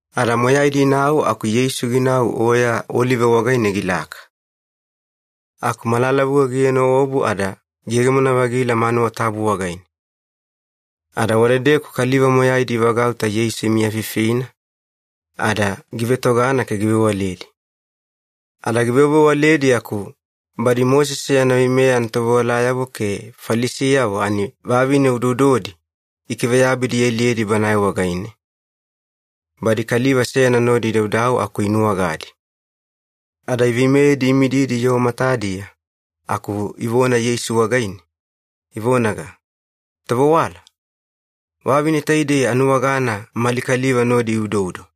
Ada moyaidi inau aku Yeisu ginau Oya Olive wagaine gilaka. Aku malalavuga gienoobu ada giyegemona-vagila manuwa tabu wagaine. Ada wadedeku kaliva moyaidi ivagauta Yeisu imiyafifina, ada givetogana ke givewaledi. Ada givewavewaledi aku badi Mosese yana veimeya anatovewalayavo ke Falisiyavo ani vavine udoudodi ikiveyabidi ialiyedi Banae wagaine, badi kaliva seyana nodi idaudau aku inuwagadi. Ada iveimeyedi imididi yoo matadiya aku ivona Yeisu wagaine, ivonaga, “Tovewala, vavine taidei anuwagana mali kaliva nodi iudoudo.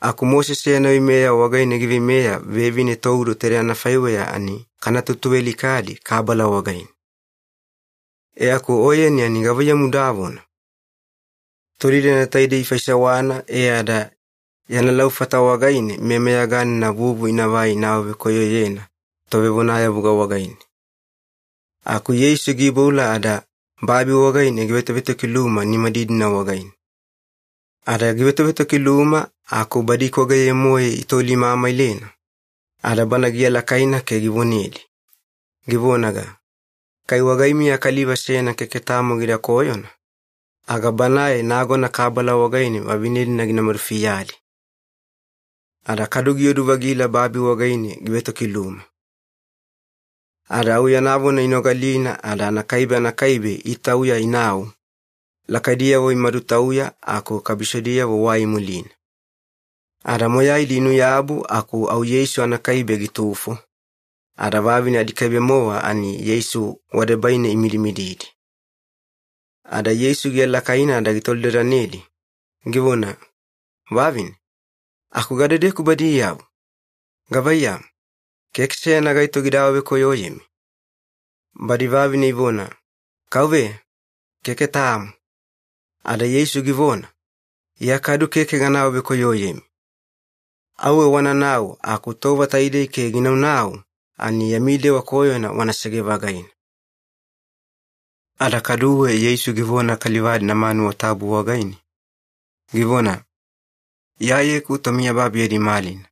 Aku Mosese yana veimeya wagaine giveimeya vevine toudo taidei anafaiweya ani kana tutuvealikadi kabala wagaine. E aku Oyeni ani gavaiyamu udavona?” Tolidadana taidei ifaisewana e ada yana laufata wagaine meyameyaganina vuvu inavai ina awavekoyoyena tovevonayavuga wagaine. Aku Yeisu giiboula ada babi wagaine givetovetokiluma nimadidina wagaine. Ada givetovetokiluma aku badi ikwageye-moe itolimamailena, ada bana gialakaina ke givonedi, givonaga, “Kai wagaimiya kaliva seyana keke tamo gida koyona, aga banae nagona kabala wagaine vavine-dina gina madufiyadi.” Ada kadu giodu-vagila babi wagaine givetokiluma. Ada au yana vona inogalina ada anakaibe anakaibe itauya inau, lakaidiyavo imadutauya aku kabisodiyavo wai imulina. Ada moyaidi inu-yabu aku au Yeisu anakaibe gitufo, ada vavine adikaibe-mowa ani Yeisu wadebaine imidimididi. Ada Yeisu gialakaina ada gitolidadanedi, givona, “Vavine, aku gadedeku badiyavo? Gavaiyamu, keke seyana gaito gida awavekoyoyemi?” Badi vavine ivona, “Kauveya, keke tamo.” Ada Yeisu givona, “Iya kadu keke gana awavekoyoyemi. Auwe wananau, aku tova taidei ke gina naunau ani yami dewa koyona wanasege-vagaina.” Ada kaduwe Yeisu givona kaliva-dina manuwa tabu wagaine, givona, “Iyayeku tomiyababi yadi malina.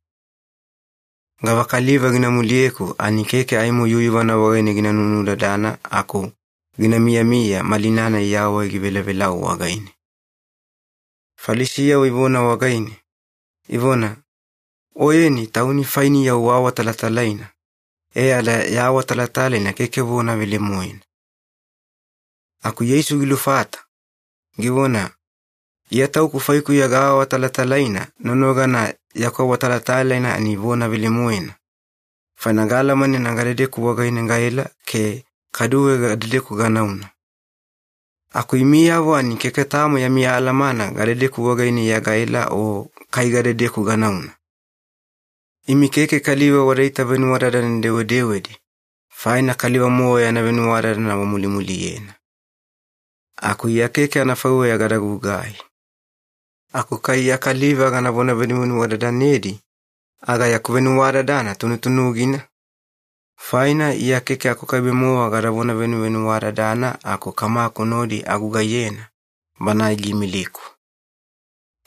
Gavakaliva gina muliyeku ani keke aimo yuyuvana wagaine gina nunudadana aku gina miyamiya malina-nai yawai givelevelau wagaine.” Falisiyavo ivona wagaine, ivona, “Oyeni Tauni fainiya uawatalatalaina e ada ya awatalatalaina keke vona velemoena.” Aku Yeisu gilufata, givona, “Iya Tauku faikuya gaawatalatalaina nonogana yaku awatalatalaina ani vona velemoena, faina gaalamanena gadedeku wagaine gaela ke kaduwe gadedeku ganauna. Aku imiyavo ani keke tamo yami alamana gadedeku wagaine Iya gaela o kai gadedeku ganauna. Imi keke kaliva wada itavenuwadadane-dewedewedi, faina kaliva-mowa yana venuwadadana wamulimuliyena. Aku Iya keke anafaiweya gada gugai. Aku kai Iya kaliva ganavona venuvenuwadadanedi aga yaku venuwadadana tunutunugina, faina Iya keke akukaibe-mowa gadavona venuvenuwadadana aku Kamaku nodi agugaiyena, Banae giimiliku.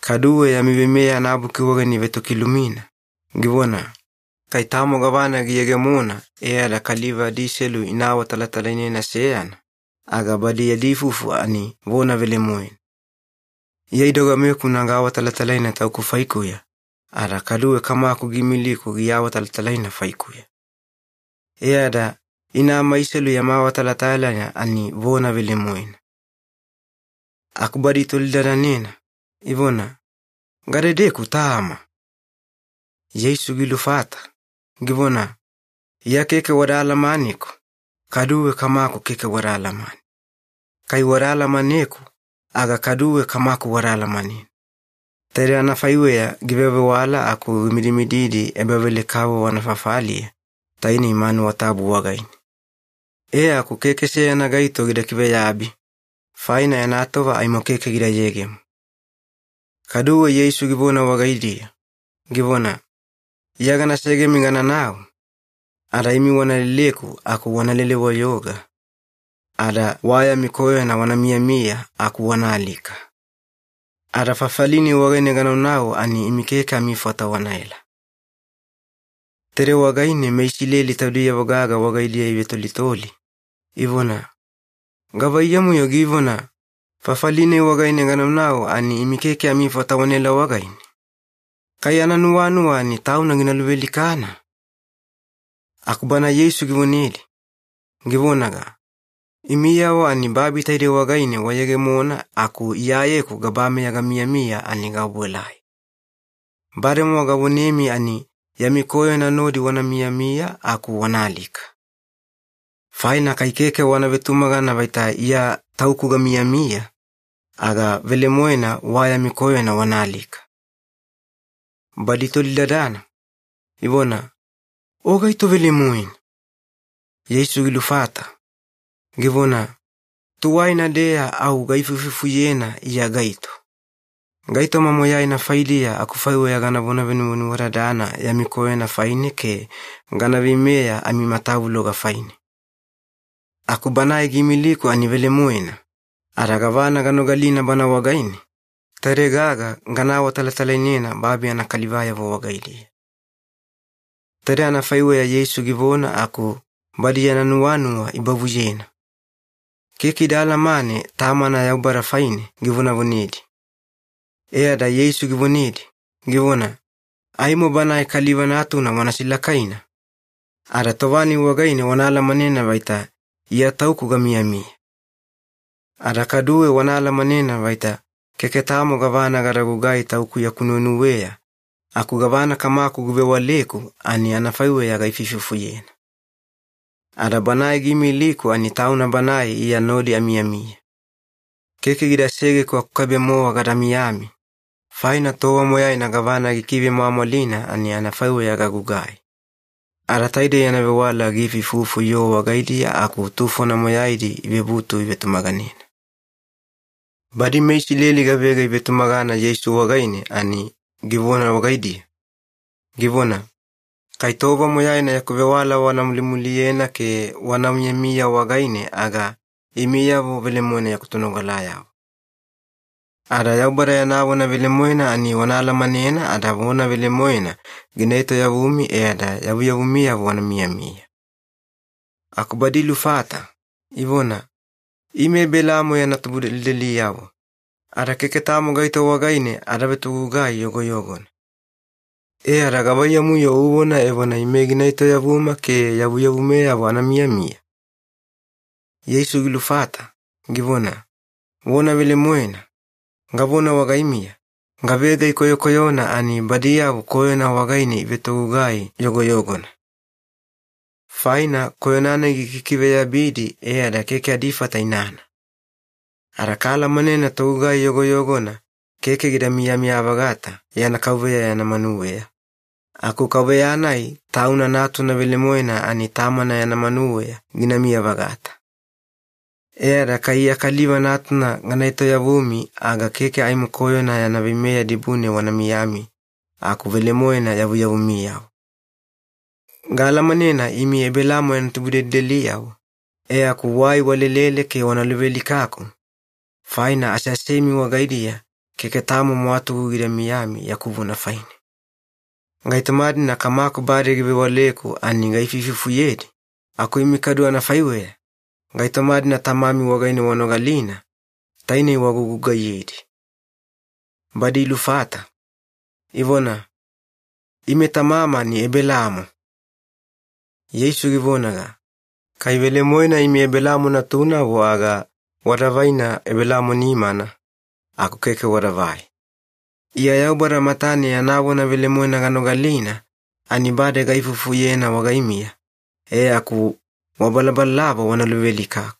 Kaduwe yami Veimeya anabuki wagaine ivetokilumina, givona, ‘Kai tamo gavana giyegemona e ada kaliva adiselu ina awatalatalainena seyana, aga badi yadi ifufu ani vona velemoena.’ Iya idogamekuna gaawatalatalaina Tauku faikuya, ada kaduwe Kamaku giimiliku giawatalatalaina faikuya. E ada ina amaiselu yama awatalatalaina ani vona velemoena.” Aku badi itolidadanena, ivona, “Gadedeku Tama?” Yeisu gilufata, givona, “Iya keke wada alamaneku, kaduwe Kamaku keke wada alamane. Kai wada alamaneku aga kaduwe Kamaku wada alamanena.” Taidei anafaiweya givewavewala aku gimidimididi ebavelekavovo anafafaliya, tainei manuwa tabu wagaine. E aku keke seyana gaito gida kiveyabi, faina yana tova aimo keke gida yegemo. Kaduwe Yeisu givona wagaidiya, givona, “Iya gana segemi gananau, ada imi wana leleku aku wana lele-wayoga, ada wa yami koyona wana miyamiya aku wana alika. Ada fafali-nai wagaine ganaunau ani imi keke amifata wanaela.” Taidei wagaine meIsileli taudiyavo gaga wagaidiya ivetolitoli, ivona, “Gavaiyamu-yo givona, ‘Fafali-nai wagaine ganaunau ani imi keke amifata wanaela wagaine’? Kai ananuwanuwa ani Tauna gina luvealikana?” Aku Bana Yeisu givonedi, givonaga, “Imiyavo ani babi taidei wagaine wayegemona aku Iyayeku gabameya gamiyamiya ani gaobuelai. Bademowa gavonemi ani yami koyona nodi wana miyamiya aku wana alika. Faina kai keke wana vetumagana vaita IYA TAUKU GAMIYAMIYA, aga velemoena wa yami koyona wana alika.” Badi itolidadana, ivona, “O gaito velemoena?” Yeisu gilufata, givona, “Tuwaina-deya au gaifuifufuyena Iya gaito. Gaitoma moyaina faidiya akufaiweya ganavona venuvenuwadadana yami koyona faine ke gana veimeya amimatavuloga faine. Aku Banae giimiliku ani velemoena, ada gavana ganogalina Bana wagaine, taide gaga gana awatalatalainena babi anakalivayavo wagaidiya.” Taidei anafaiweya Yeisu givona aku badi yana nuwanuwa ibavuyena. Keke ida alamane Tamana Yaubada faine givonevonedi. E ada Yeisu givonedi, givona, “Aimo Banae Kaliva Natuna wana silakaina, ada tova-nai wagaine wana alamanena vaita ‘IYA TAUKU GAMIYAMIYA’. Ada kaduwe wana alamanena vaita keke tamo gavana gada gugai Tauku yaku nuwenuweya aku gavana Kamaku givewaleku ani anafaiweya gaifuifufuyena. Ada Banae giimiliku ani Tauna Banae Iya nodi amiyamiya. Keke gida segeku akukaibe-mowa gada miyami, faina tova moyaina gavana gikivemwamwalina ani anafaiweya gagugai.” Ada taidei yana vewala giifuifufu yoo wagaidiya aku tufona moyaidi ivebutu ivetumaganena. Badi meIsileli gavega ivetumagana Yeisu wagaine ani givona wagaidiya, givona, “Kai tova moyaina yaku vewala wana mulimuliyena ke wana miyamiya wagaine aga imiyavo velemoena yaku tonogalayavo. Ada Yaubada yana vona velemoena ani wana alamanena ada vona velemoena gina etoyavumi e ada yavuyavumiyavo wana miyamiya.” Aku badi ilufata, ivona, “Ime Ebelaamo yana tubudelideliyavo ada keke tamo gaito wagaine ada vetogugai yogoyogona. E ada gavaiyamu-yo uvona evona ime gina etoyavuma ke yavuyavumeyavo ana miyamiya?” Yeisu gilufata, givona, “Vona velemoena, gavona wagaimiya, gavega ikoyokoyona ani badiyavo koyona wagaine ivetogugai yogoyogona. Faina koyona-nai gikikiveyabidi e ada keke adifata inana. Ada kaalamanena togugai yogoyogona keke gida miyamiya-vagata yana kauveya yana manuweya, aku kauveya-nai tauna natuna velemoena ani tamana yana manuweya ginamiya-vagata. E ada kai Iya Kaliva Natuna gana etoyavumi aga keke aimo koyona yana veimeya dibune wana miyami aku velemoena yavuyavumiyavo. Gaalamanena imi Ebelaamo yana tubudelideliyavo, e aku wai walelele ke wana luvealikaku, faina aseasemi wagaidiya keke tamo mwatugu gida miyami yaku vona faine. Gaitoma-dina Kamaku bade givewaleku ani gaifuifufuyedi, aku imi kadu anafaiweya, gaitoma-dina tamami wagaine wanogalina, tainei wagugugaiyedi.” Badi ilufata, ivona, “Ime tamama ani Ebelaamo.” Yeisu givonaga, “Kai velemoena imi Ebelaamo natunavo aga wada vaina Ebelaamo nimana, aku keke wadavai. Iya Yaubada matane yana vona velemoena ganogalina ani bade gaifufuyena wagaimiya, e aku wabalabalalava wana luvealikaku.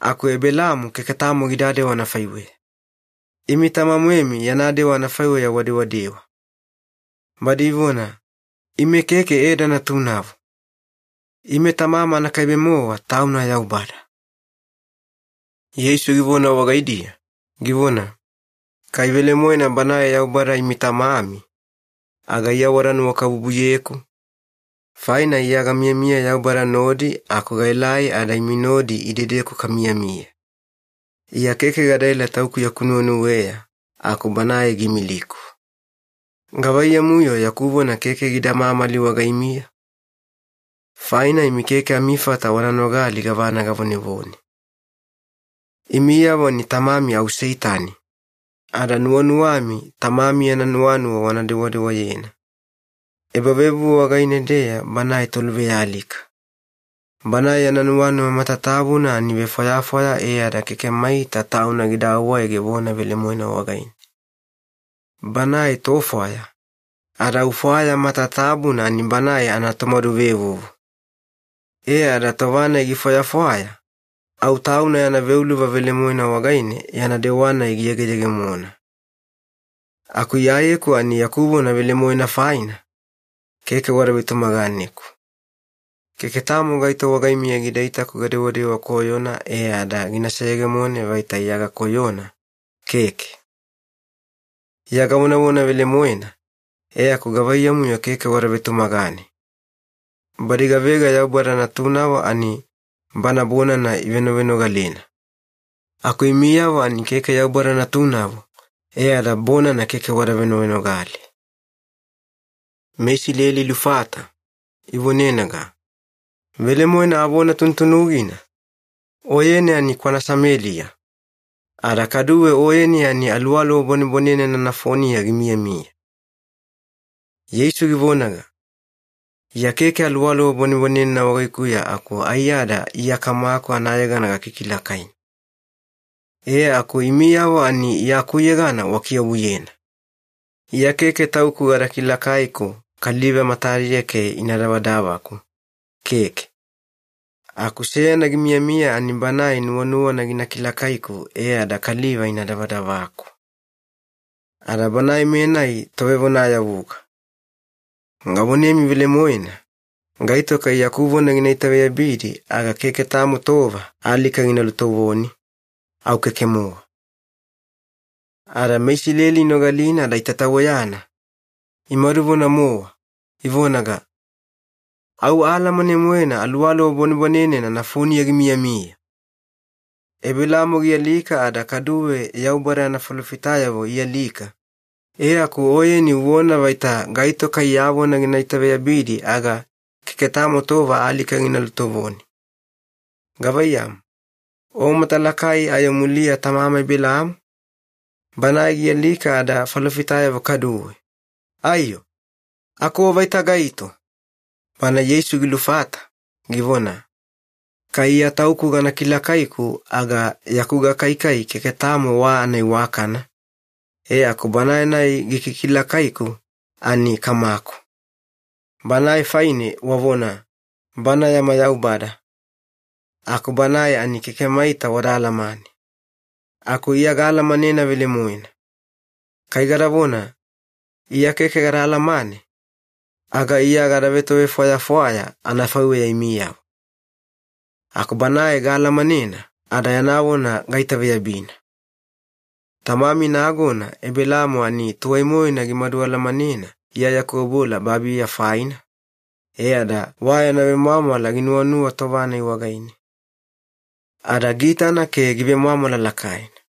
Aku Ebelaamo keke tamo gidadewa anafaiweya. Imi tama-moemi yana dewa anafaiweya wadewadewa.” Badi ivona, “Ime keke eda natunavo. Ime Tamama anakaibe-mowa Tauna Yaubada.” Yeisu givona wagaidiya, givona, “Kai velemoena Banae Yaubada imi Tamami, aga Iya wada nuwakabubuyeku, faina Iya gamiyamiya Yaubada nodi aku gaelai ada imi nodi idedeku kamiyamiya. Iya keke gadaela Tauku yaku nuwenuweya aku Banae giimiliku. Gavaiyamu-yo yaku vona keke gida mamali wagaimiya? Faina imi keke amifata wana nogali gavana gavonevone. Imiyavo ani tamami au Seitani, ada nuwanuwami tamami yana nuwanuwa wana dewadewayena. Ebavevuvu wagaine-deya banae toluvealika. Banae yana nuwanuwa matatabuna ani vefwayafwaya e ada keke maita tauna gida awaege vona velemoena wagaine. Banae tofwaya, ada au fwaya matatabuna ani banae anatomaduvevuvu. E ada tova-nai gifwayafwaya, au tauna yana veuluva velemoena wagaine yana dewa-nai giyegeyegemona. Aku Iyayeku ani yaku vona velemoena faina, keke wada vetumaganeku. Keke tamo gaito wagaimiya gida itaku gadewadewa koyona e ada gina seyegemone vaita Iya gakoyona, keke. Iya gavonavona velemoena, e aku gavaiyamu-yo keke wada vetumagane? Badi gavega Yaubada natunavo ani Bana bonana ivenovenogalena. Aku imiyavo ani keke Yaubada natunavo, e ada bonana keke wada venovenogale.” MeIsileli ilufata, ivonenaga, “Velemoena avona tunutunugina, Oyeni ani kwana Sameliya, ada kaduwe Oyeni ani aluwaluwa bwanebwanenena nafoniya gimiyamiya.” Yeisu givonaga, “Iya keke aluwaluwa bwanebwanenena wagaikuya aku aiyada Iya Kamaku anayegana gakikilakaina. E aku imiyavo ani Iya akuyegana wakiobuyena. Iya keke Tauku gada kilakaiku kaliva matadiya ke ina davadavaku, keke. Aku seyana gimiyamiya ani Banae nuwanuwana gina kilakaiku e ada kaliva ina davadavaku. Ada Banae-menai Tovevonayavuga. Gavonemi velemoena, gaito kai yaku vona gina itaveyabidi aga keke tamo tova alika gina lutovoni, au keke-mowa.” Ada meIsileli inogalina ada itataweyana, imaduvona-mowa, ivonaga, “Au, aalamane-moena aluwaluwa bwanebwanenena nafoniya gimiyamiya! Ebelaamo gialika ada kaduwe Yaubada yana falofitayavo ialika, e aku Oyeni uvona vaita gaito kai ya vona gina itaveyabidi aga keke tamo tova alika gina lutovoni. Gavaiyamu, o matalakai ayo muliya tamama Ebelaamo? Banae gialika ada falofitayavo kaduwe. Aiyo! Aku O vaita gaito?” Bana Yeisu gilufata, givona, “Kai Iya Tauku gana kilakaiku aga yaku gakaikai keke tamo wa anaiwakana, e aku Banae-nai gikikilakaiku ani Kamaku. Banae faine wavona, ‘Bana yama Yaubada,’ aku Banae ani keke maita wada alamane. Aku Iya gaalamanena velemoena. Kai gadavona, ‘Iya keke gada alamane,’ aga Iya gada vetovefwayafwaya anafaiweya imiyavo. Aku Banae gaalamanena, ada yana vona gaitaveyabina. Tamami nagona Ebelaamo ani tuwai-moena gimadu alamanena Iya yaku obuela babiya faina, e ada wa yana vemwamwala ginuwanuwa tova-nai wagaine. Ada giitana ke givemwamwala lakaina.”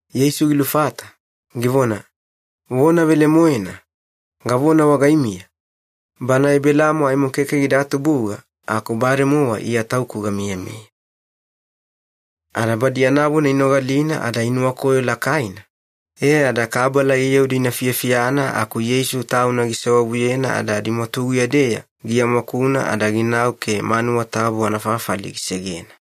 Yeisu gilufata, givona, “Vona velemoena, gavona wagaimiya, bana Ebelaamo aimo keke gida tubuga aku bademowa IYA TAUKU GAMIYAMIYA.” Ada badi yana vona inogalina ada inuwakoyo lakaina, e ada kabala iyaudi ina ifiyafiyana aku Yeisu Tauna gisewavuyena ada adimwatuguya-deya giamwakuna ada ginau ke manuwa tabu anafafali gisegena.